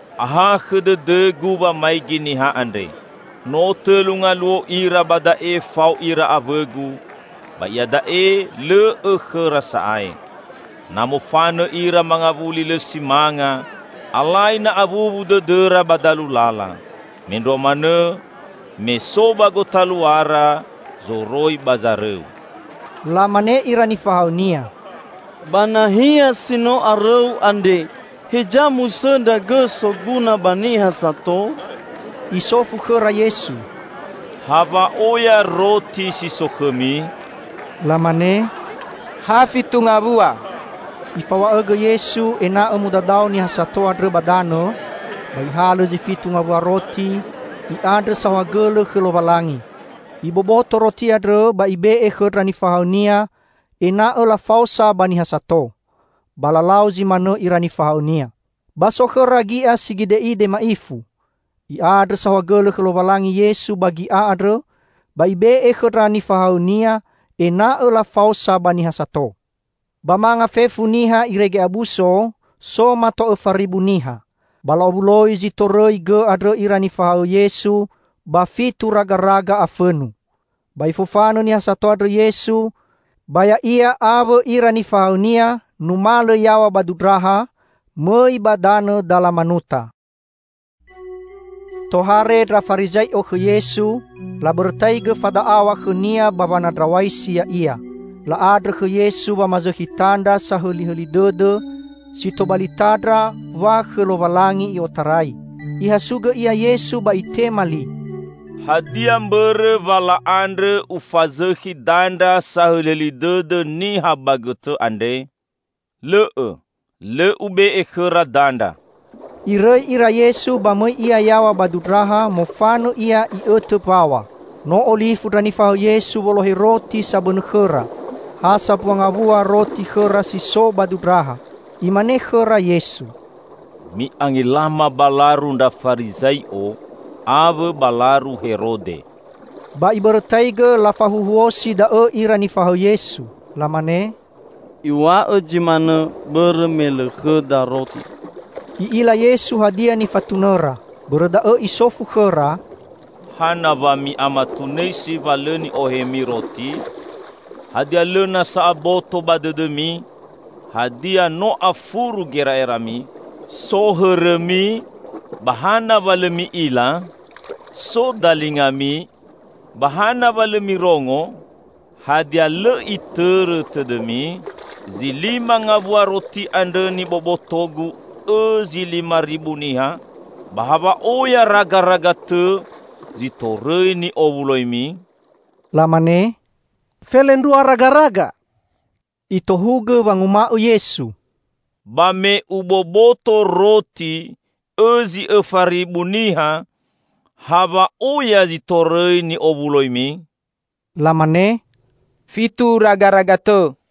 "Ahakhõ dõdõ-Gu wamaigi niha andre. No tõlu ngaluo ira ba da'e fao ira awõ-Gu, ba iada'e lõ õ khõra sa'ae. Na mofanõ ira mangawuli lõ si manga, alai na awuwu dõdõra ba dalu lala. Mendrua manõ me so ba gotaluara zoroi ba zarõu." Lamane ira nifahaõ-Nia, "Ba nahia si no arõu andre, heza musõndra gõ soguna ba niha sato?" Isofu khõra Yesu, "Ha wa'oya roti si so khõmi?" Lamane, "Ha fitu ngawua!" Ifaw̃a'õgõ Yesu ena'õ mudadao niha sato andrõ ba danõ, ba Ihalõ zi fitu ngawua roti, I'andrõ saohagõlõ khõ Lowalangi. Iboboto roti andrõ ba Ibe'e khõ ndra nifahaõ-Nia ena'õ lafaosa ba niha sato. Ba lalau zi manõ ira nifahaõ-Nia. Ba so khõra gi'a si gide'ide ma'ifu. I'andrõ saohagõlõ khõ Lowalangi Yesu ba gi'a andrõ ba Ibe'e khõ ndra nifahaõ-Nia ena'õ lafaosa ba niha sato. Ba manga fefu niha irege abuso, so mato õfa ribu niha. Ba la'owuloi zi torõi gõ andrõ ira nifahaõ Yesu ba fitu ragaraga afõnu. Ba Ifofanõ niha sato andrõ Yesu, ba Ya'ia awõ ira nifahaõ-Nia numalõ yaw̃a ba dundraha mõi ba danõ Dalamanuta. Tohare ndra Farizai'o khõ Yesu, labõrõtaigõ fada'aw̃a khõ-Nia ba wanandraw̃aisi Ya'ia. La'andrõ khõ Yesu wamazõkhi tandra sahõlihõli dõdõ si tobali tandra wa khõ Lowalangi I'otarai. Ihasugõ Ia Yesu ba Itema li, "Hadia mbõrõ wa la'andrõ Ufazõkhi dandra sahõlihõli dõdõ niha ba gõtõ andre? Lõ'õ! Lõ Ube'e khõra dandra!" Irõi ira Yesu, ba mõi Ia yaw̃a ba dundraha; mofanõ Ia I'õtõ mbaw̃a. No olifu ndra nifahaõ Yesu wolohe roti sabõnõ khõra. Ha sambua ngawua roti khõra si so ba dundraha. Imane khõra Yesu, "Mi'angelama ba laru ndra Farizai'o, awõ ba laru Herode." Ba ibõrõtaigõ lafahuhuosi da'õ ira nifahaõ Yesu. Lamane, "Iw̃a'õ zi manõ bõrõ me lõ khõda roti." I'ila Yesu hadia nifatunõra. Bõrõ da'õ Isofu khõra, "Hana wa mi'amatunõisi wa lõ ni'ohemi roti? Hadia lõ nasa aboto ba dõdõmi? Hadia no afuru gera'erami? So hõrõmi -- ba hana wa lõ mi'ila? So dalingami -- ba hana wa lõ mirongo? Hadia lõ itõrõ tõdõmi, zi lima ngawua roti andrõ niboboto-Gu õ zi lima ribu niha? Ba ha wa'oya ragaraga tõ zi torõi ni'owuloimi?" Lamane, "Felendrua ragaraga." Itohugõ wanguma'õ Yesu, "Ba me Uboboto roti õ zi õfa ribu niha, ha wa'oya zi torõi ni owuloimi?" Lamane, "Fitu ragaraga tõ."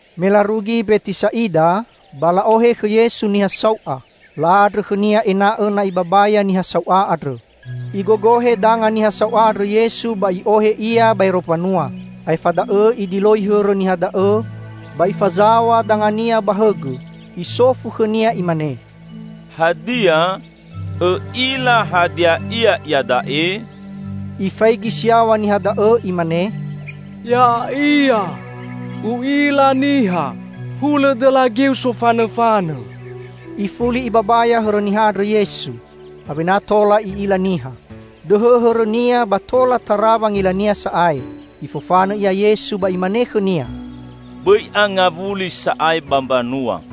Me larugi Mbetisa'ida, ba la'ohe khõ Yesu niha sau'a. La'andrõ khõ-Nia ena'õ na Ibabaya niha sau'a andrõ. Igogohe danga niha sau'a andrõ Yesu ba I'ohe ia baero mbanua. Aefa da'õ Idiloi hõrõ niha da'õ ba Ifazaw̃a danga-Nia ba hõgõ. Isofu khõnia Imane, "Hadia, õ'ila hadia ia iada'e?" Ifaigi si yaw̃a niha da'õ imane, "Ya'ia. U'ila niha hulõ dõla geu sofanõfanõ." Ifuli Ibabaya hõrõ niha andrõ Yesu. Awena tola i'ila niha. Dõhõ hõrõnia ba tola tara wangilania sa'ae. Ifofanõ ia Yesu ba Imane khõnia, "Bõi angawuli sa'ae ba mbanua."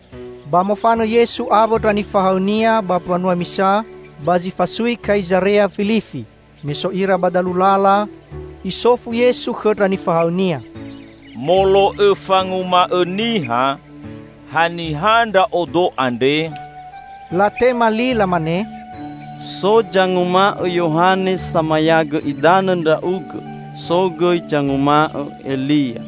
Ba mofanõ Yesu awõ ndra nifahaõ-Nia ba mbanua misa ba zi fasui Kaizarea-Filifi. Me so ira ba dalu lala Isofu Yesu khõ ndra nifahaõ-Nia, "Molo'õ fanguma'õ niha, haniha Ndra'odo andre?" Latema li lamane, "So zanguma'õ Yohane Samayagõ Idanõ Ndra'ugõ; so gõi zanguma'õ Elia,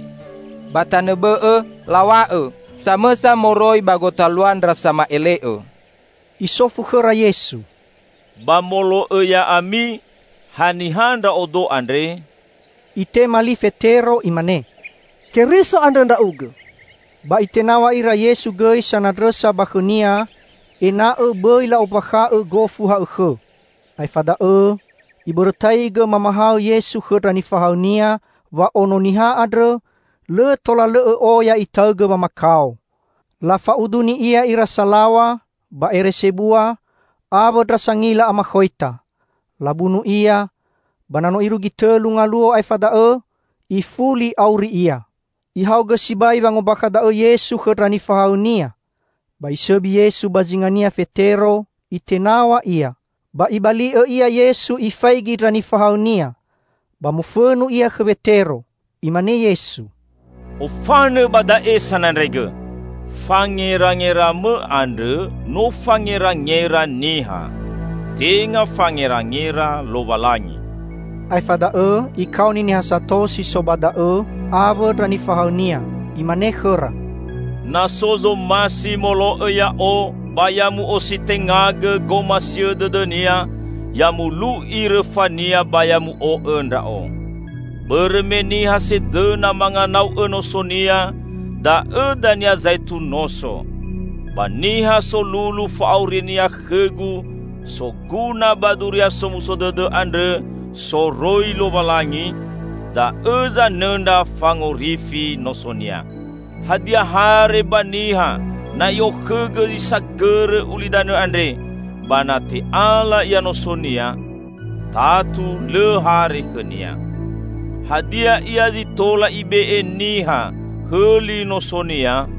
ba tanõ bõ'õ law̃a'õ: samõsa moroi ba gotalua ndra sama'ele'õ!" Isofu khõra Yesu, "Ba molo'õ ya'ami, haniha Ndra'odo andre?" Itema li Fetero, imane: "Keriso andrõ Ndra'ugõ!" Ba Itenaw̃a ira Yesu gõi sanandrõsa ba khõ-Nia, ena'õ bõi la'ombakha'õ gofu ha'õkhõ. Aefa da'õ, Ibõrõtaigõ mamahaõ Yesu khõ ndra nifahaõ-Nia wa Ono Niha andrõ, lõ tola lõ'õ oya Itaõgõ wamakao. Lafa'uduni Ia ira salaw̃a ba ere sebua awõ ndra sangila amakhoita. Labunu Ia, ba na no irugi tõlu ngaluo aefa da'õ, ifuli auri Ia. Ihaogõ sibai wangombakha da'õ Yesu khõ ndra nifahaõ-Nia. Ba isõbi Yesu ba zingania Fetero, itenaw̃a Ia. Ba Ibali'õ Ia Yesu Ifaigi ndra nifahaõ-Nia, ba mofõnu Ia khõ Wetero. Imane Yesu, "Ofanõ ba da'e, Sanandraigõ! Fangerangeramõ andrõ no fangerangera niha; tenga fangerangera Lowalangi!" Aefa da'õ Ikaoni niha sato si so ba da'õ awõ ndra nifahaõ-Nia. Imane khõra, "Na so zomasi molo'õ Ya'o, ba ya mu'ositengagõ gomasiõ dõdõnia, ya mulu'i rõfania, ba ya mu'o'õ Ndra'o. Bõrõ me niha sedõna manganau'õ nosonia, da'õ dania zaetu noso. Ba niha solulu fa'aurinia khõ-Gu soguna ba Duria Somuso Dõdõ andrõ soroi Lowalangi, da'õ zanõndra fangorifi nosonia. Hadia hare ba niha, na i'okhõgõ zi sagõrõ ulidanõ andre, ba na te'ala ia nosonia? Tatu lõ hare khõnia. Hadia ia zi tola ibe'e niha hõli nosonia?